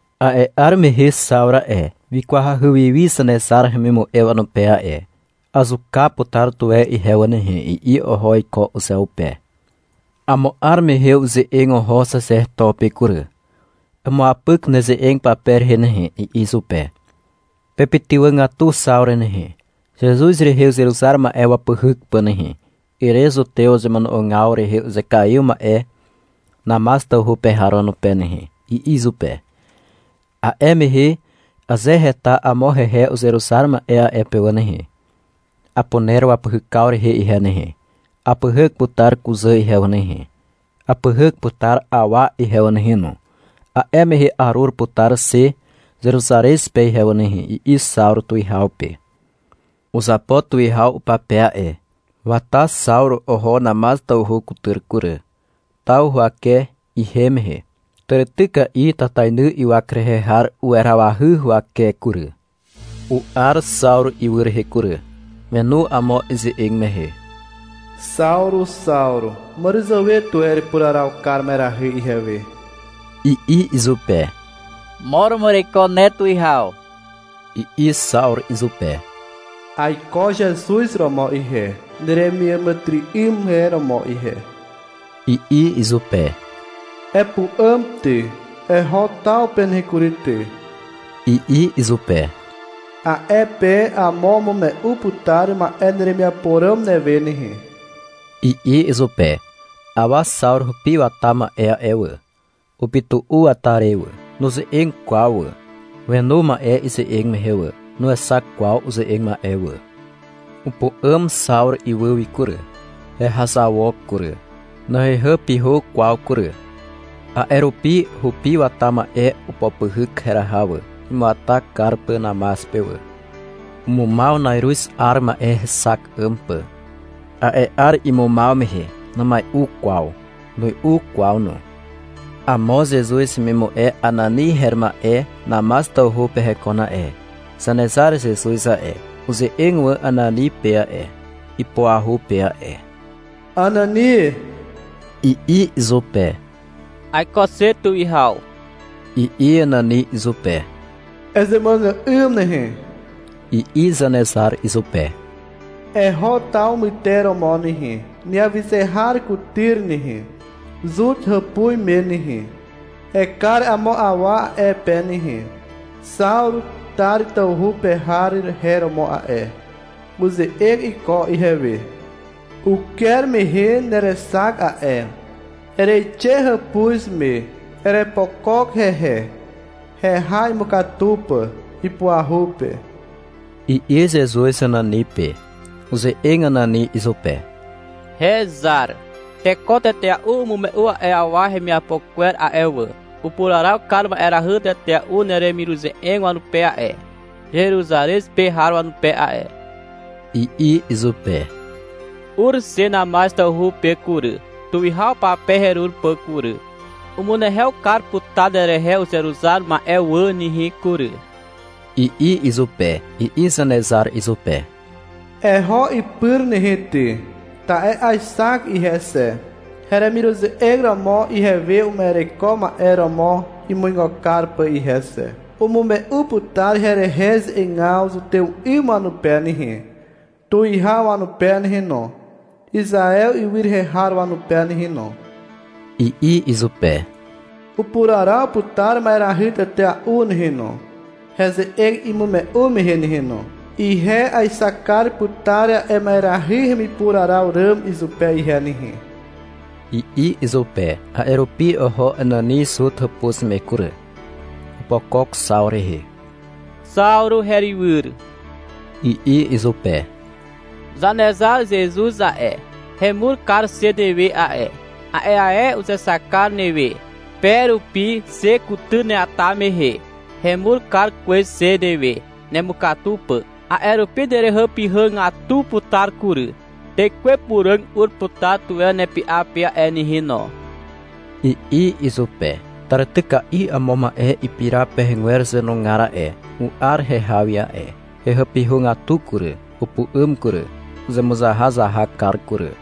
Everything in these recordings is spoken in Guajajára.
A'e 'ar mehe Xawru a'e, wikwahy wi wi Zanezar hemimu'e wanupe a'e. — Azuka putar tuwe ihe wà nehe, i'i oho iko uzeupe. Amo 'ar mehe uze'eg oho xaxeto pe kury. — Emuapyk neze'eg pape rehe nehe, i'i izupe. — Pepytywàgatu Xawru nehe, Zezuz rehe uzeruzar ma'e wapyhyk pà nehe, ere zutew wazemono'ogaw rehe uzekaiw ma'e Namaz tawhu pe har wanupe nehe, i'i izupe. — A'e mehe aze heta amo hehe uzeruzar ma'e a'e pe wà nehe, apuner wapyhykaw rehe ihe nehe. Apyhyk putar kuzà ihe wà nehe, apyhyk putar awa ihe wà nehe no. A'e mehe arur putar xe Zeruzarez pe ihe wà nehe, i'i Xawru tuwihaw pe. Uzapo tuwihaw upape a'e. Wata Xawru oho Namaz tawhu kutyr kury. Taw huwake ihem mehe, tàrityka'i tatainy ywak rehe har uwerawahy huwake kury. U'ar Xawru ywy rehe kury. Wenu amo ize'eg mehe. — Xawru, Xawru, màràzàwe tuwe erepuraraw kar ma'erahy ihewe, i'i izupe. — Mo romo ereiko ne, tuwihaw, i'i Xawru izupe. — Aiko Zezuz romo ihe, neremiàmàtyry'ym e romo ihe, i'i izupe. — Epu'àm ty, eho taw pe nehe kury ty, i'i izupe. — A'e pe amo umume'u putar ma'e neremiapo ràm newe nehe, i'i izupe. Awa Xawru hupi wata ma'e a'e wà, upytu'u wata re wà. Nuze'eg kwaw wà. Wenu ma'e ize'eg mehe wà. Nuexak kwaw uze'eg ma'e wà. Upu'àm Xawru ywy wi kury. Hehazawok kury. Nahehàpyhà kwaw kury. A'e rupi hupi wata ma'e opopyhyk heraha wà, imuata kar pà Namaz pe wà. Umumaw na'iruz 'ar ma'e hexak 'ym pà. A'e 'ar imumaw mehe numai'u kwaw. Nui'u kwaw no. Amo Zezuz hemimu'e Anani her ma'e Namaz tawhu pe hekon a'e. Zanezar Zezuz a'e, uze'eg wà Anani pe a'e, ipuahu pe a'e. — Anani, i'i izupe. — Aiko xe, tuwihaw, i'i Anani izupe. — Ezemuàgà'ym nehe, i'i Zanezar izupe. -Eho taw myteromo nehe, neawyze har kutyr nehe, Zut hàpuz me nehe. Ekar amo awa a'e pe nehe. Xawru Tar tawhu pe har her romo a'e. Uze'eg iko ihewe. Uker mehe nerexak a'e. Ereixe hàpuz me, erepokok hehe, heha imukatu pà, ipuahu pe, i'i Zezuz Anani pe. Uze'eg Anani izupe. — Hezar. Teko tetea'u umume'u a'e awa hemiapo kwer a'e wà. Upuraraw kar ma'erahy tetea'u neremiruze'eg wanupe a'e, Zeruzarez pe har wanupe a'e, i'i izupe. — Ur xe Namaz tawhu pe kury, tuwihaw pape herur pà kury. Umunehew kar putar nerehe uzeruzar ma'e wà nehe kury, i'i izupe. I'i Zanezar izupe. — Eho ipyr nehe ty. Ta'e aexak ihe xe, heremiruze'eg romo ihewe uma'ereko ma'e romo imuigo kar pà ihe xe. Umume'u putar herehe ze'egaw zutew 'ym wanupe nehe, tuwihaw wanupe nehe no, Izaew ywy rehe har wanupe nehe no, i'i izupe. — Upuraraw putar ma'erahy tetea'u nehe no, heze'eg imume'u mehe nehe no. Ihe aexak kar putar a'e ma'erahy hemipuraraw ràm izupe ihe nehe, i'i izupe. A'e rupi oho Anani Zut hàpuz me kury. Opokok Xawru rehe. — Xawru herywyr, i'i izupe. — Zanezar Zezuz a'e, hemur kar xe newe a'e. A'e ae uzexak kar newe, pe rupi xe kutyr neata mehe. Hemur kar kwez xe newe, nemukatu pà. A'e rupi nerehàpyhàgatu putar kury. Tekwe Puràg ur putar tuwe nepy'a pe a'e nehe no, i'i izupe. Tàrityka'i amo ma'e ipira pekwer zàwenugar a'e, u'ar heha wi a'e. Hehàpyhàgatu kury. Upu'àm kury. Uzemuzahazahak kar kury.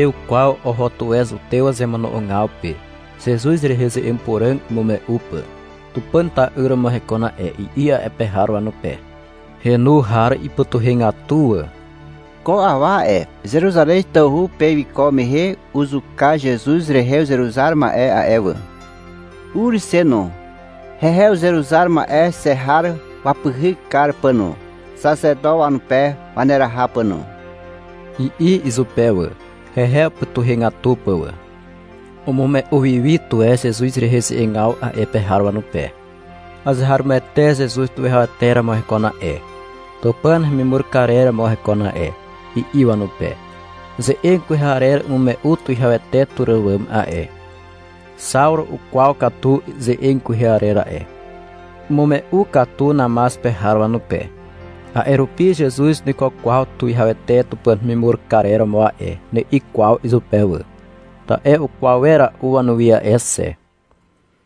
Na'iàrew kwaw oho tuwe zutew wazemono'ogaw pe, Zezuz rehe ze'eg puràg imume'u pà. — Tupàn ta'yr romo hekon a'e, i'i a'e pe har wanupe. Henu har ipytuhegatu wà. — Ko awa a'e, Zeruzarez tawhu pe wiko mehe uzuka Zezuz rehe uzeruzar ma'e a'e wà. Ur xe no, hehe uzeruzar ma'e xe har wapyhyk kar pà no, xaxeto wanupe waneraha pà no, i'i izupe wà, hehe upytuhegatu pà wà. Umume'u wi wi tuwe Zezuz rehe ze'egaw a'e pe har wanupe. -Azeharomoete Zezuz tuwihawete romo hekon a'e, Tupàn hemimur karer romo hekon a'e, i'i wanupe. Ze'eg kwehe arer umume'u tuwihawete tur àwàm a'e. Xawru ukwaw katu ze'eg kwehe arer a'e. Umume'u katu Namaz pe har wanupe. A'e rupi — Zezuz nuiko kwaw tuwihawete Tupàn hemimur karer romo a'e, ni'i kwaw izupe wà, ta'e ukwaw wera'u wanuwi a'e xe.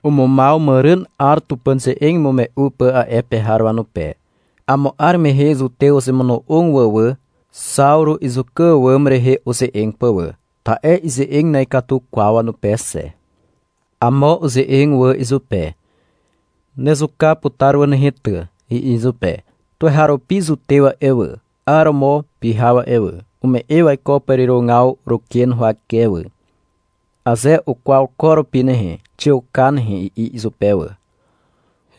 Umumaw màràn 'ar Tupàn ze'eg imume'u pà a'e pe har wanupe. Amo 'ar mehe zutew uzemono'og wà wà, Xawru izuka àwàm rehe uze'eg pà wà, ta'e ize'eg na'ikatu kwaw wanupe xe. Amo uze'eg wà izupe. — Nezuka putar wà nehe ty, i'i izupe. Tuweharupi zutew a'e wà, 'aromo pyhaw a'e wà, ume'e waiko pàrirogaw ruken huwake wà. — Aze ukwaw ko rupi nehe, xiuka nehe, i'i izupe wà.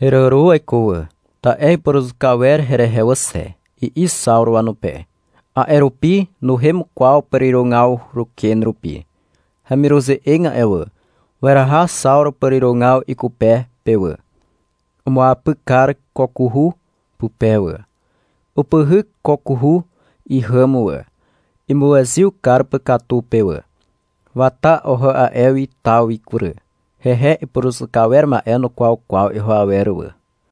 — Heràro waiko wà, ta'e ipuruzuka wer herehe wà xe, i'i Xawru wanupe. A'e rupi nuhem kwaw pàrirogaw ruken rupi. Hemiruze'eg a'e wà, weraha Xawru pàrirogaw ikupe pe wà. Umuapyk kar kokuhu pupe wà. Upyhyk kokuhu ihàm wà, imuezyw kar pà katu pe wà. Wata oho a'e wi taw wi kury. Hehe ipuruzuka wer ma'e nukwaw kwaw iho awer wà.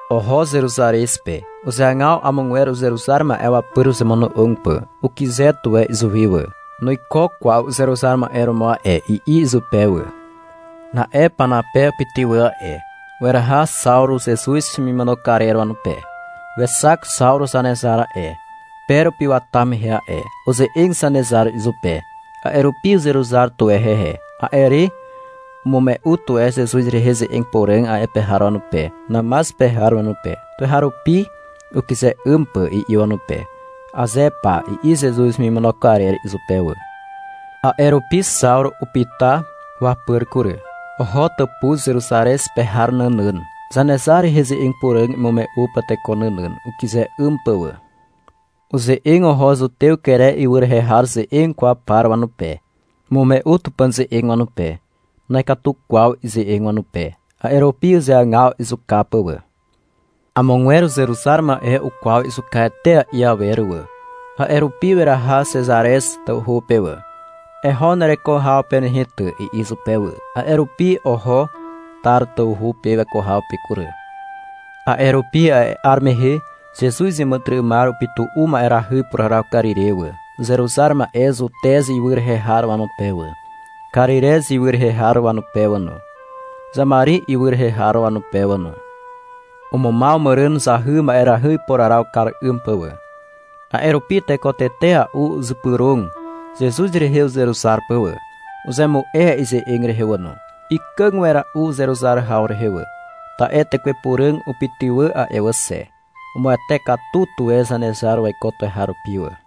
Oho Zeruzarez pe. Uzeagaw amogwer uzeruzar ma'e wapyr uzemono'og pà. Ukyze tuwe izuwi wà. — Nuiko kwaw uzeruzar ma'e romo a'e, i'i izupe wà. Na'e Panape upytywà a'e. Weraha Xawru Zezuz hemimono karer wanupe. — Wexak Xawru Zanezar a'e, pe rupi wata mehe a'e. Uze'eg Zanezar izupe. A'e rupi uzeruzar tuwe hehe. A'e re umume'u tuwe Zezuz rehe ze'eg puràg a'e pe har wanupe, Namaz pe har wanupe, tuweharupi, ukyze 'ym pà, i'i wanupe. — Aze pa, i'i Zezuz hemimono karer izupe wà. A'e rupi Xawru upyta wapyr kury. Oho tàpuz Zeruzarez pe har nànàn, Zanezar rehe ze'eg puràg imume'u pà teko nànàn, ukyze 'ym pà wà. Uze'eg oho zutew Kere ywy rehe har ze'eg kwaw par wanupe. Umume'u Tupàn ze'eg wanupe. Na'ikatu kwaw ize'eg wanupe. A'e rupi uzeagaw izuka pà wà. Amogwer uzeruzar ma'e ukwaw izuka etea'i awer wà. A'e rupi weraha Xezarez tawhu pe wà. — Eho nereko haw pe nehe ty, i'i izupe wà. A'e rupi oho Tar tawhu pe weko haw pe kury. A'e rupi a'e 'ar mehe Zezuz iàmàtyry'ymar upytu'u ma'erahy ipuraraw kar ire wà, uzeruzar ma'e Zutez ywy rehe har wanupe wà, Karirez ywy rehe har wanupe wà no, Xamari ywy rehe har wanupe wà no. Umumaw màràn zahy ma'erahy ipuraraw kar 'ym pà wà. A'e rupi teko tetea'u uzypyrog Zezuz rehe uzeruzar pà wà. Uzemu'e ize'eg rehe wà no. Ikàg wera'u uzeruzar haw rehe wà. Ta'e Tekwe Puràg upytywà a'e wà xe. Umuwete katu tuwe Zanezar waiko tuweharupi wà.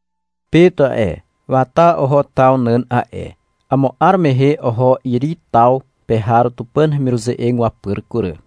Pet a'e, wata oho taw nàn a'e. Amo 'ar mehe oho Iri taw pe har Tupàn hemiruze'eg wapyr kury.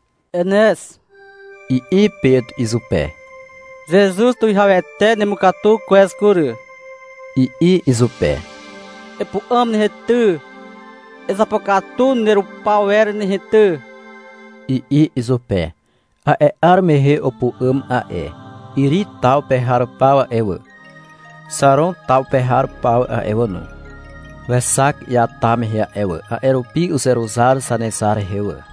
— Enez, i'i Pet izupe. — Zezuz tuwihawete nemukatu kwez kury, i'i izupe. — Epu'àm nehe ty, ezapokatu nerupawer nehe ty, i'i izupe. A'e 'ar mehe we upu'àm a'e. Iri taw pe har paw a'e wà, Xaron taw pe har paw a'e wà no, wexak iata mehe a'e wà. A'e rupi uzeruzar Zanezar rehe wà.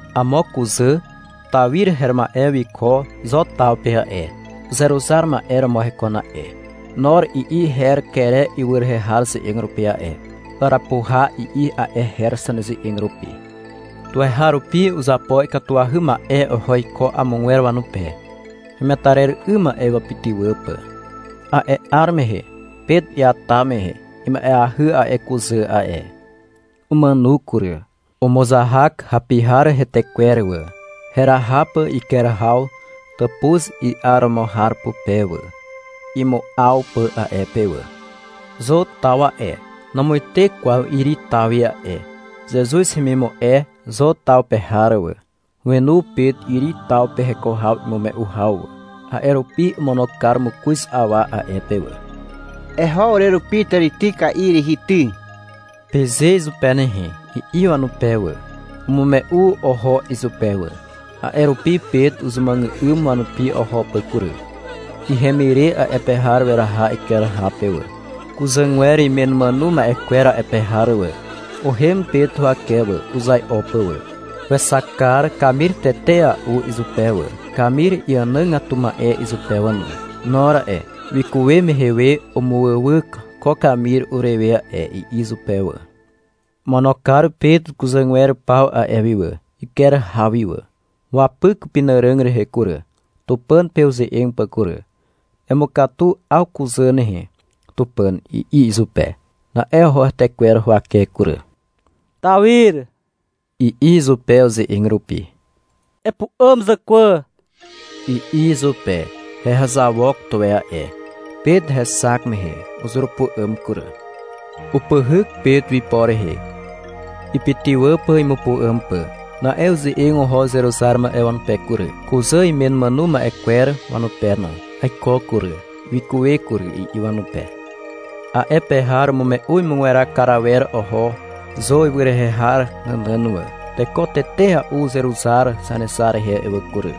Amo kuzà Tawir her ma'e wiko Zo taw pe a'e. Uzeruzar ma'e romo hekon a'e. (— Nor i'i her Kere ywy rehe har ze'eg rupi a'e. — Arapuha, i'i a'e her zaneze'eg rupi.) Tuweharupi uzapo ikatuahy ma'e oho iko amogwer wanupe, hemetarer 'ym ma'e wapytywà pà. A'e 'ar mehe, Pet iata mehe, ima'eahy a'e kuzà a'e. Umàno kury. Umuzahak hapi har hetekwer wà, heraha pà iker haw tàpuz i'aromo har pupe wà, imu'aw pà a'e pe wà. Zo taw a'e, namuite kwaw Iri taw wi a'e. Zezuz hemimu'e Zo taw pe har wà, wenu Pet Iri taw pe heko haw imume'u haw wà. A'e rupi omono kar mokoz awa a'e pe wà. — Eho urerupi tàrityka'i rihi ty, peze izupe nehe, i'i wanupe wà. Umume'u oho izupe wà. A'e rupi Pet uzemuàgà'ym wanupi oho pà kury. Ihem ire a'e pe har weraha iker haw pe wà. Kuzàgwer imen umàno ma'e kwer a'e pe har wà, uhem Pet huwake wà, uzai'o pà wà. Wexak kar kamir tetea'u izupe wà, kamir iànàgatu ma'e izupe wà no. — Nor a'e, wikuwe mehe we umuwywyk ko kamir urewe a'e, i'i izupe wà. Omono kar Pet kuzàgwer paw a'e wi wà, iker haw wi wà. Wapyk upenàràg rehe kury, Tupàn pe uze'eg pà kury. — Emukatu 'aw kuzà nehe, Tupàn, i'i izupe. Na'e oho hetekwer huwake kury. — Tawir, i'i izupe uze'eg rupi. -Epu'àm zàkwà, i'i izupe. Hehazawok tuwe a'e. Pet hexak mehe uzurupu'àm kury. Upyhyk Pet ipo rehe, ipytywà pà imupu'àm pà. Na'e uze'eg oho uzeruzar ma'e wanupe kury, kuzà imen umàno ma'e kwer wanupe no. Aiko kury, wikuwe kury, i'i wanupe. A'e pe har umume'u imugweraw kar awer oho Zo ywy rehe har nànàn wà. Teko tetea'u uzeruzar Zanezar rehe a'e wà kury.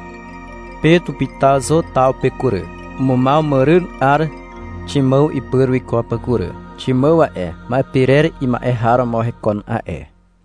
Pet upyta Zo taw pe kury. Umumaw màràn 'ar Ximàw ipyr wiko pà kury. Ximàw a'e, ma'e pirer ima'e har romo hekon a'e.